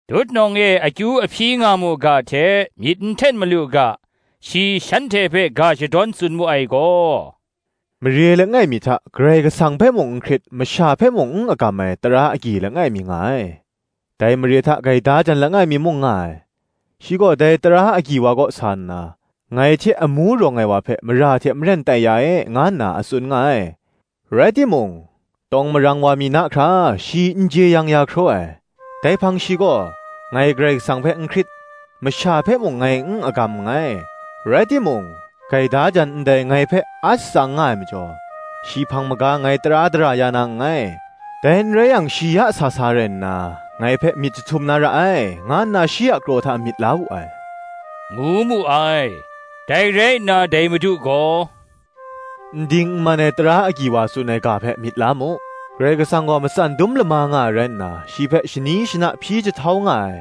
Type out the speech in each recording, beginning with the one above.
Tutnawng e akyu a hpyi nga mu ga hte myit n hten malu ga, shi shanhte hpe ga shadawn tsun mu ai gaw, “Mare langai mi hta, Karai Kasang hpe mung n hkrit masha hpe mung n agam ai tara agyi langai mi nga ai. Dai mare hta gaida jan langai mi mung nga ai; shi gaw dai tara agyi wa kaw sa nna, ‘Ngai hte amu rawng ai wa hpe mara hte maren tai ya e,’ nga nna a tsun nga ai. Rai timung, tawng marang wa mi na hkra, shi n jeyang ya hkraw ai: dai hpang shi gaw, ‘Ngai Karai Kasang hpe n hkrit, masha hpe mung ngai n agam nngai, rai timung, gaida jan ndai ngai hpe a shatsang nga ai majaw, shi hpang maga ngai tara dara ya na nngai; dai n rai yang shi ya sa sa rai nna, ngai hpe myit jahtum na ra ai, nga nna shi a kraw hta myit la wu ai,’ ngu mu ai. Dai rai nna dai Madu gaw, “N ding n man ai tara agyi wa tsun ai ga hpe myit la mu: Karai Kasang gaw matsan dum lama nga ai rai nna, shi hpe shani shana hpyi jahtau nga ai,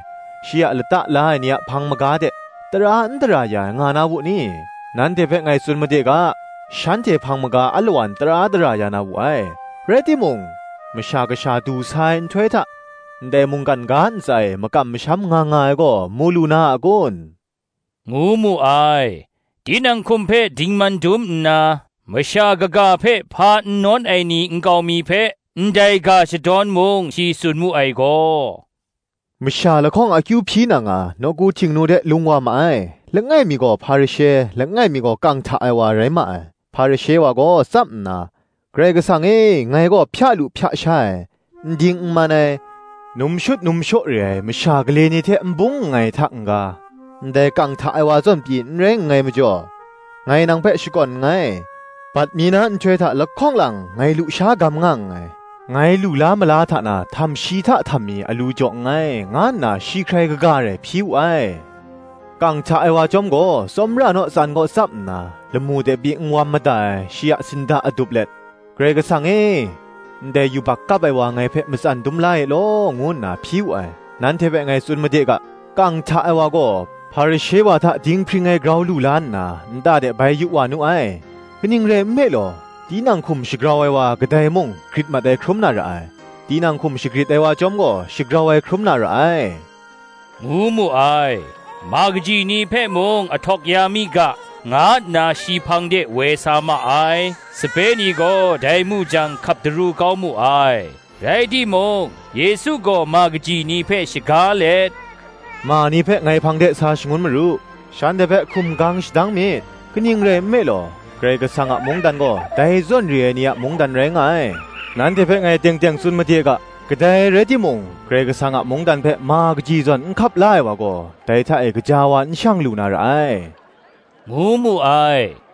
shi a lata la ai ni a hpang maga de, tara n dara ya ai, nga na wu ni? Nanhte hpe ngai tsun made ga, Shanhte hpang maga alawan tara dara ya na wu ai. Rai timung, Masha Kasha du sa ai nhtoi hta, ndai mungkan ga ntsa e makam masham nga nga ai gaw, mu lu na a kun?” ngu mu ai. Tinang hkum hpe dingman dum nna, masha kaga hpe hpa n nawn ai ni nkau mi hpe, ndai ga shadawn mung shi tsun mu ai gaw, “Masha lahkawng akyu hpyi na nga, Nawku Htingnu de lung wa ma ai; langai mi gaw Hparishe, langai mi gaw kang hta ai wa, rai ma ai. Hparishe wa gaw tsap nna, ‘Karai Kasang e, ngai gaw hpya lu hpya sha ai, n ding n man ai, num shut num shaw re ai masha gale ni hte n bung nngai hta n-ga, ndai kang hta ai wa zawn pyi n rai nngai majaw, ngai nang hpe shakawn nngai: bat mi na nhtoi hta lahkawng lang ngai lusha gam nga nngai; ngai lu la mala hta na htamshi hta htammi alu jaw nngai,’ nga nna shi hkrai kaga rai hpyi wu ai. Kang hta ai wa chyawm gaw, tsawmra naw tsan kaw tsap nna, lamu de pyi n wam mada ai; shi a sinda adup let, ‘Karai Kasang e, ndai yubak kap ai wa ngai hpe matsan dum la e law,’ ngu nna hpyi wu ai. Nanhte hpe ngai tsun made ga, kang hta ai wa gaw Hparishe wa hta dinghpring ai grau lu la nna, nta de bai yu wa nu ai: kaning rai nme law, tinang hkum shagrau ai wa kadai mung grit mat ai hkrum na ra ai; tinang hkum shagrit ai wa chyawm gaw, shagrau ai hkrum na ra ai,” ngu mu ai. Ma kaji ni hpe mung ahtawk ya mi ga, nga nna shi hpang de woi sa ma ai: sape ni gaw dai mu jang hkap daru kau mu ai. Rai timung Yesu gaw ma kaji ni hpe shaga let, “Ma ni hpe ngai hpang de sa shangun maru; shanhte hpe hkum gang shadang myit: kaning rai nme law, Karai Kasang a mungdan gaw, dai zawn re ai ni a mungdan rai nga ai. Nanhte hpe ngai teng teng tsun made ga, Kadai rai timung, Karai Kasang a mungdan hpe, ma kaji zawn n hkap la ai wa gaw, dai hta e gaja wa n shang lu na ra ai,” ngu mu ai.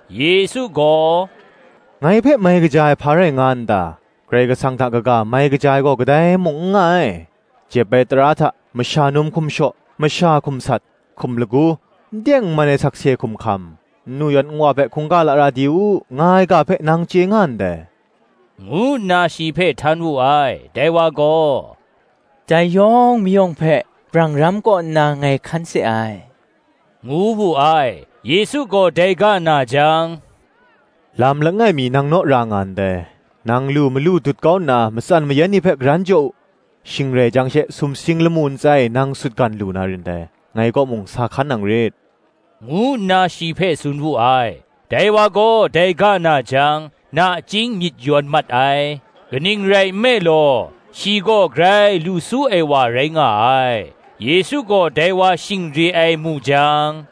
Yesu gaw, “Ngai hpe, mai kaja ai, hpa rai nga n ta? Karai Kasang hta kaga, mai kaja ai gaw kadai mung n nga ai. Jep ai tara hta, Masha num hkum shaw, masha hkum sat, hkum lagu, n teng n man ai sakse hkum hkam, nnu yan nwa hpe hkungga lara di u, nga ai ga hpe nang chye nga ndai,” ngu nna shi hpe htan wu ai. Dai wa gaw, “Dai yawng mayawng hpe brang ram kaw nna ngai hkan se ai, ngu wu ai. Yesu gaw dai ga na jang, Lam langai mi nang naw ra nga ndai: nang lu malu dut kau nna matsan mayan ni hpe karan jaw u; shing rai jang she, sumsing lamu ntsa e nang sutgan lu na rin dai: ngai kaw mung sa hkan nang rit,” ngu nna shi hpe tsun wu ai. Dai wa gaw dai ga na jang, nachying myit yawn mat ai: kaning rai nme law, shi gaw grai lu su ai wa rai nga ai. Yesu gaw dai wa shing re ai mu jang,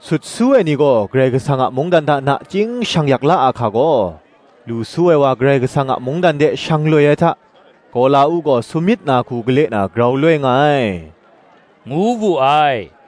“Sut su ai ni gaw Karai Kasang a mungdan hta nachying shang yak la ahka gaw! Lu su ai wa Karai Kasang a mungdan de shang loi ai hta, gawla-uk gaw samyit na hku gale na grau loi nga ai,” ngu wu ai.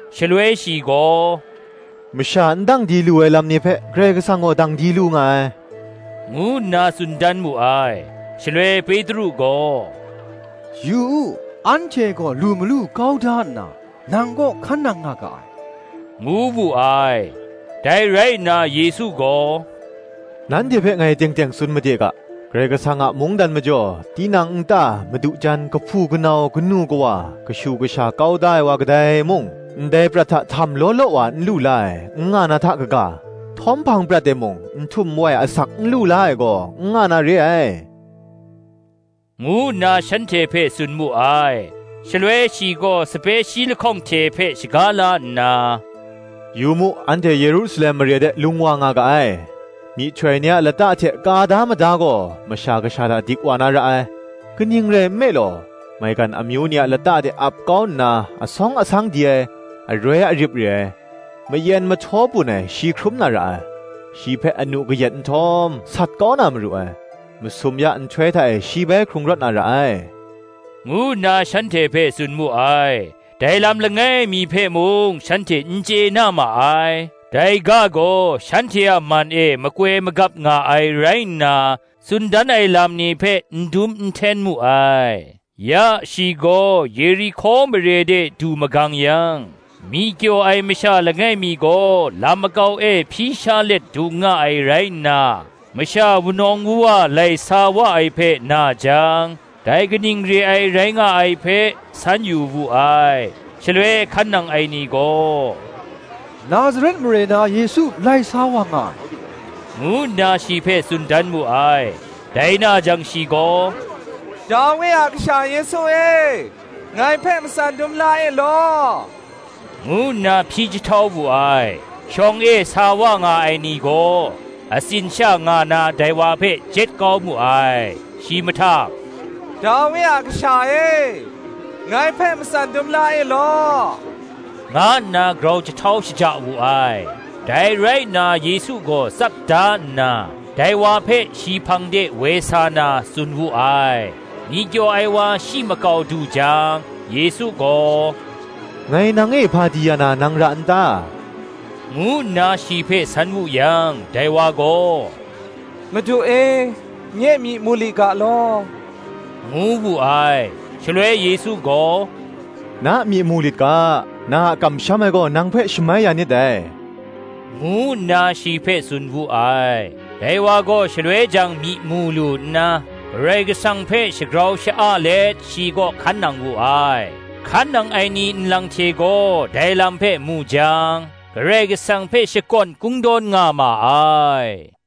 Shaloi shi gaw, “Masha n dang di lu ai lam ni hpe, Karai Kasang gaw dang di lu nga ai,” ngu nna tsun dan mu ai. Shaloi Petru gaw, “Yu u, anhte gaw lu malu kau da nna, nang kaw hkan nang nga ga ai,” ngu wu ai. Dai rai nna Yesu gaw, “Nanhte hpe ngai teng teng tsun made ga, Karai Kasang a mungdan majaw, tinang nta, madu jan, kahpu kanau, kanu kawa, kashu kasha, kau da ai wa kadai mung, ndai prat hta htam law law wa n lu la ai, n nga na hta kaga, htawm hpang prat e mung, n htum n wai asak n lu la ai gaw, n nga na re ai,” ngu nna shanhte hpe tsun mu ai. Shaloi shi gaw sape shi lahkawng hte hpe shaga la nna, “Yu mu, Anhte Yerusalem mare de lung wa nga ga ai; myihtoi ni a lata hte ka da mada gaw, Masha Kasha hta dik wa na ra ai. Kaning rai nme law, maigan amyu ni a lata de ap kau na, asawng asang di ai, aroi arip re ai, mayen mahtaw bun ai, shi hkrum na ra ai: shi hpe anu kayat nhtawm, sat kau na maru ai: masum ya nhtoi hta e shi bai hkrung rawt na ra ai,” ngu nna shanhte hpe tsun mu ai. Dai lam langai mi hpe mung shanhte n chye na ma ai: dai ga gaw shanhte a man e makoi magap nga ai rai nna, tsun dan ai lam ni hpe n dum n hten mu ai. Ya shi gaw Yerihko mare de du magang yang, myi kyaw ai masha langai mi gaw lam makau e hpyi sha let dung nga ai rai nna, masha wunawng wuwa lai sa wa ai hpe na jang, dai kaning re ai rai nga ai hpe, san yu wu ai. Shaloi hkan nang ai ni gaw, “Nazaret mare na Yesu lai sa wa nga ai,” ngu nna shi hpe tsun dan mu ai. Dai na jang shi gaw, “Dawi a kasha Yesu e, ngai hpe matsan dum la e law,” ngu nna hpyi jahtau wu ai. Shawng e sa wa nga ai ni gaw, atsin sha nga na dai wa hpe jet kau mu ai. Shi mahtang, “Dawi a kasha e, ngai hpe matsan dum la e law,” nga nna grau jahtau shaja wu ai. Dai rai nna Yesu gaw tsap da nna, dai wa hpe shi hpang de woi sa na, tsun wu ai. Myi kyaw ai wa shi makau du jang, Yesu gaw, Ngai nang e hpa di ya na, nang ra n ta? ngu nna shi hpe san wu yang, dai wa gaw, “Madu e, nye myi mu li ga law,” ngu wu ai. Shaloi Yesu gaw, “Na myi mu lit ga; na a kamsham ai gaw nang hpe shamai ya nit dai,” ngu nna shi hpe tsun wu ai. Dai wa gaw shaloi jang myi mu lu nna, Karai Kasang hpe shagrau sha-a let shi kaw hkan nang wu ai: hkan nang ai ni nlang hte gaw dai lam hpe mu jang, Karai Kasang hpe shakawn kungdawn nga ma ai.